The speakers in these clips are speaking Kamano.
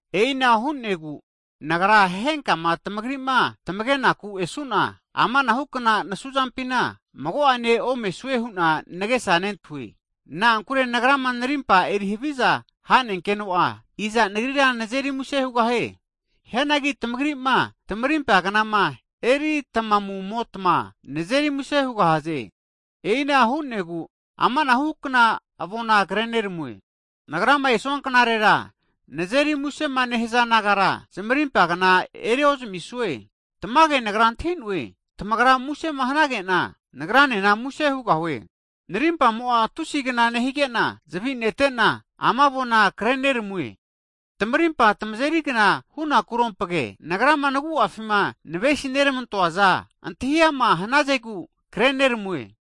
E'ina hu'nagu nagra henkama tamagri'ma tamage'naku esu'na, amanahukna nasuzampina mago'ane omesue hu'na nagesa nentahue. Na'ankure nagrama tamarimpa eri haviza hanenkeno'a, iza nagrira nazeri muse hugahie? Hianagi tamagri'ma, tamarimpa knama eritamumotma nazeri muse hugahaze. E'ina hu'negu, amanahukna avona kre neramue. Nagrama esoa knarera, nazeri musema nehaza nagara, zmarimpa kna eri ozamisue. Tamage nagra antahi'noe, tamagra musema hanage'na, nagranena muse hugahue. Narimpamo'a tusigna nehige'na zavi netena, ama avona kreneramue. Tamarimpa tamazeri kna hunakurompage, nagrama nagu'afima navesineramantoaza antahiama hnazegu kreneramue.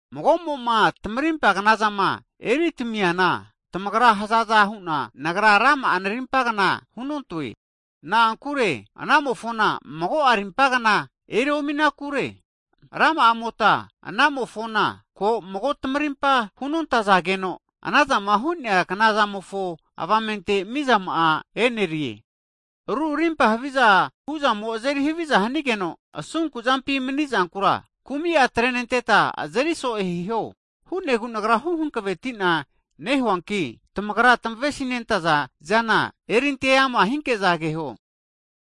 Mago'mo'ma tamarimpa knazama eritamiana, tamagrama hazaza hu'na nagra rama'a narimpagna hunontoe. Na'ankure anamofona mago'a arimpa kna eriominakure. Rama'amota anamofona ko mago tamarimpa hunontazageno, anazama hu'nea knazamofo avamente mizama'a e'nerie. Ru arimpa haviza hu'zamo azeri haviza hanigeno asunkuzampi mani'zankura, kumi'a atrenenteta azeri so'e hiho. Ana hu'negu nagra huhankaveti'na nehuanki, tamagrama tamavesi'nentaza zana erinte ama hinke'za keho.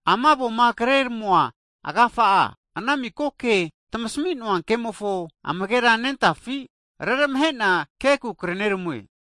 Ama avoma kreramua agafa'a, ana miko ke tmasami'noa kemofo amagera nentafi, reramahe'na kenaku kreneramue.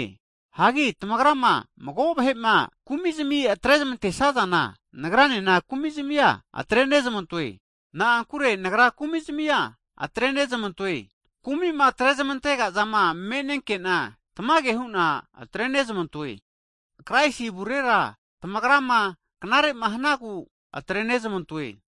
Hagi tamagrama mago vahema kumizmi atrezamantesazana, nagranena kumizmia atrenezmantoe. Na'ankure nagra kumizmia atrenezmantoe, [kumima atrezmantegazama menenkena tamage huna atrenezmantoe], Kraisi avurera tamagrama knarema hanagu atrenezamantoe.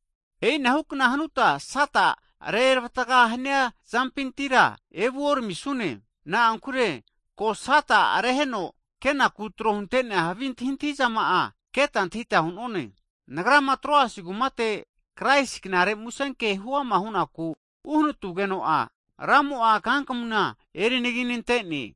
E'inahukna hanuta Sata reravataga hania zampintira evuoramisune. Na'ankure ko Sata reraheno kenaku tro hunte'nea havi antahizama'a, keta antahita hu'none. Nagrama Troasi kumate Kraisi knare musenke huama hunaku uhnatugeno'a, Ramo'a kankamuna erinaginantene.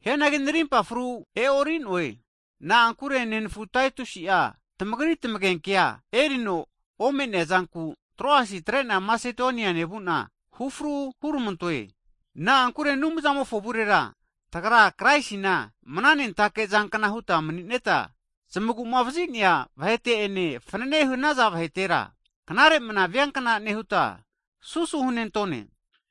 Hianagi narimpa fru e'ori'noe. Na'ankure nenafu Taetusi'a tamagri tamagenkea erino ome'neazanku, Troasia atre'na Masedonia nevu'na, hufru huramantoe. Na'ankure Anumzamofo avurera tagra Kraisina mana nentake zankna huta mani'neta, zamagumavazi'nea vahete ene fnanene hanaza vahetera knare mna viankna nehuta susu hunentone.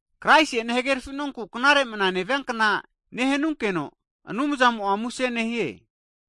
Kraisi'ene hagerfi'nonku knare mna nevia kna nehanunkeno, Anumzamo'a muse nehie.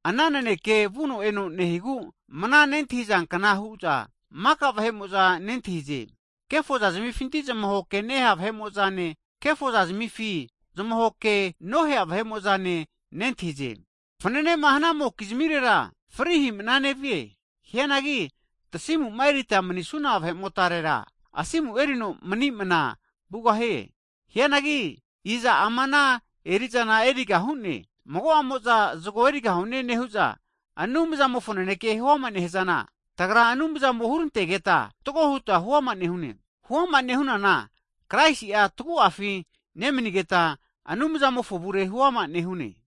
Ana naneke vuno eno nehigu mna nentahizankna hu'za maka vahe'mo'za nentahize. Kefoza zimifinti zamahoke nehea vahe'mo'zane kefoza zimifinti zamahoke nohea vahe'mo'zane nentahize. Fananema hanamokizmirera fri hi'mana nevie. Hianagi tasimuma erita manisuna vahe'motarera, asimu erino mani mana vugahie. Hianagi i'za ama ana erizana eriga hu'ne? Mago'amo'za zgo erigahune, nehu'za Anumzamofo naneke huama nehzana, tagria Anumzamo hurantegeta fatgo huta huama nehune. Huama nehunana Kraisi'a tagu'afi nemanigeta Anumzamofo avure huama' nehune.